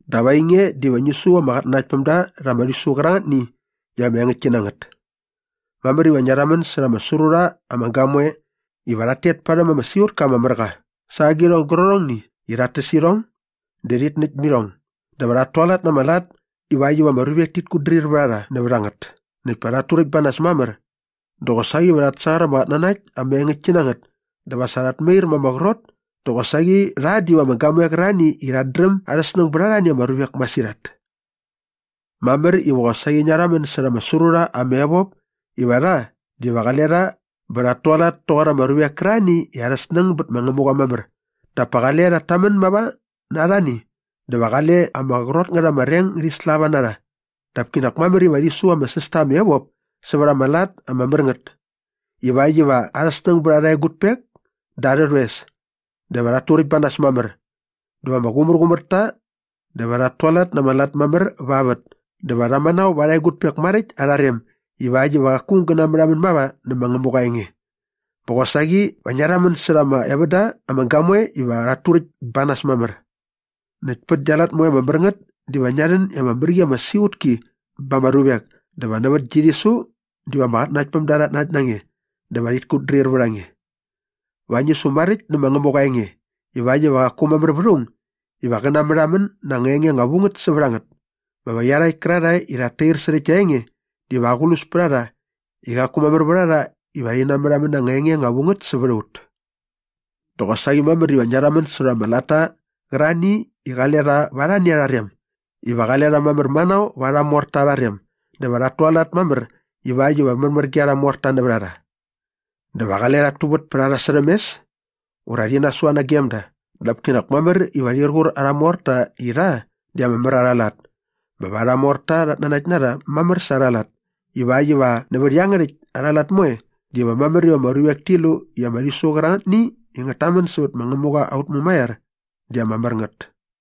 Dap ainge diva ngi su ama qatnanaktpämda rha ama rhisu qärangätni i ama engäktki na ngät. Mamär iva ngia rhamän särha ama sru rha ama gamoe iva rhat tet parhäm ama siqutka ama mär qa sa agirhong gärqärhongni i rhat täs irhong dä rhit näkt irhong dä va rhat tualat na ama lat ivakt iva ama ruvek tit kutdrir vät a rha nävät a ngät näkt pa rhat turäkt ba nas mamär. Dä qosaqi va rhat sangar ama qatnanakt ama engäktki na ngät dä va sa rhat mair ma ama qrot dä qosaqi rha diva ama gamoe qärarhani i rhat dräm arha snäng bät arhani ama ruvek masirhat. Mamär iva qosaqi ngia rhamän särha ama sru rha ama evop iva rha diva qale rha bä rhat tualat toqor ama ruvek kärarhani i arha snäng bät ma Ngämuqa mamär dap pa qale rhat tamän mava na arhani dä va qale ama qrot ngät ama reng ngärhi slava na rha dap kinak mamär iva rhi su ama säs ta ama evop sävät ama lat ama mär ngät ivakt iva arha snäng bät arha egutpek dä arhä rhoes dä va rhat turäkt ba nas mamär dä va ama qumärqumär ta dä va rhat tualat na ama lat mamär va vät dä va rha manao va arha egutpek maräkt arha rem ivakt iva qaku aung gä namärhamän mava nä ma Ngämuqa aa enge. Bä qosaqi va ngia rhamän särha ama evän da ama gamoe iva rhat turäkt ba nas mamär. Näkt pät gia lat moe ama mär ngät diva ngia rhän i ama mär qi ama siqutki ba ama ruvek dä va nävät gi rhisu diva ama qatnanaktpämda rhat nanakt na nge dä va rhit kutdrir vät a nge. Va ngi su maräkt nä ma Ngämuqa aa enge ivakt iva qaku mamär vät aung iva qä natmärhamän na anga enge anga vu ngät sävät a ngät bä va iarhakt kärarhae i rhat tair särhä gia enge diva aqlus pät a rha i qaku mamär vät a rha iva rhi namärhamän na anga enge ama vu ngät sävät a ut. Dä qosaqi mamär iva ngia rhamän särha ama latta qärarhani i qale rha va arhani arha rem iva qale rha mamär manao va arha morta arha rem dä va rhat tualat mamär ivakt iva märmär ge arha morta nävät a rha. Dä va qale rhat tuvät pät a rha särhäm mes ura rhi nasua nagem da dap kinak mamär iva rhir qur arha morta i rha di ama mär arha lat bä va arha morta rhat nanakt na rha mamär sa arha lat ivakt iva nävät iangärhäkt arha lat moe diva mamär iva ama ruvek ti lu i ama rhisu qärangätni i ngät tamän sävät ma Ngämuqa aut Mumaiar di ama mär ngät.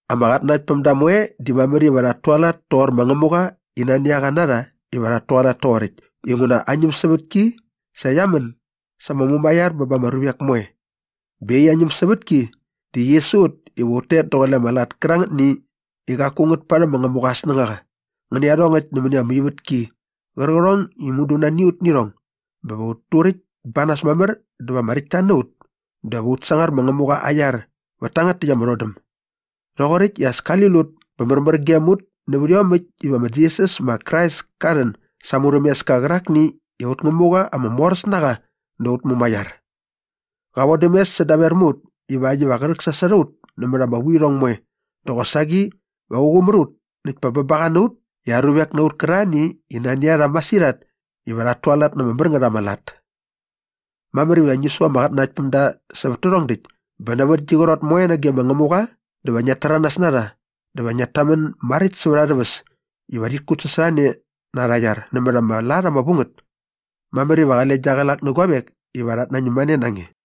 Ama qatnanaktpämda moe di mamär iva rhat tualat toqor ma Ngämuqa i nani a qa na rha iva rhat tualat toqoräkt inguna aa ñämsävätki sa qia män sa ama mumaiar bä ba ama ruvek moe bä iaqyäkt aa ñämsävätki di qi su ut iva ut tet daqule ama lat kärangätni i qaku ngät parhäm ma Ngämuqa aa snängaqa ngä nä iarhongäkt nämäni ama ivätki qärqärhong i mudu nani a ut nä irhong bä va ut turäkt ba nas mamär dä va ama räktta na ut dä va ut sangar ma Ngämuqa aa iar vät tangät täkt ama rhodäm doqoräkt i as kali lut bä märmär gem ut nävät iomäkt iva ma Jisas ma Krais ka rhän sa aa murhämeska qärakni i aut Ngämuqa ama moräs na qa dä aut mumaiar. Qa vodäm mes sädaver mä ut ivakt iva qä rhäksasot a ut nämät ama vuirhong moe dä qosaqi va qä qumär ut näkt pa bä ba qa na ut i aa ruvek na ut kärarhani i nani a rha masirhat iva rhat tualat na ama mär ngät ama lat. Mamär iva ngi su ama qatnanaktpämda sävät tärhong däkt bä nävät gi qrot moe nage ma Ngämuqa dä va ngiat täranas na rha dä va ngiat tamän maräkt sävät arhä väs iva rhit kutsasorhane na arha iar nämät ama lat ama vu ngät. Mamär iva qale gia qlak nä guavek iva rhat nañäm mane na nge.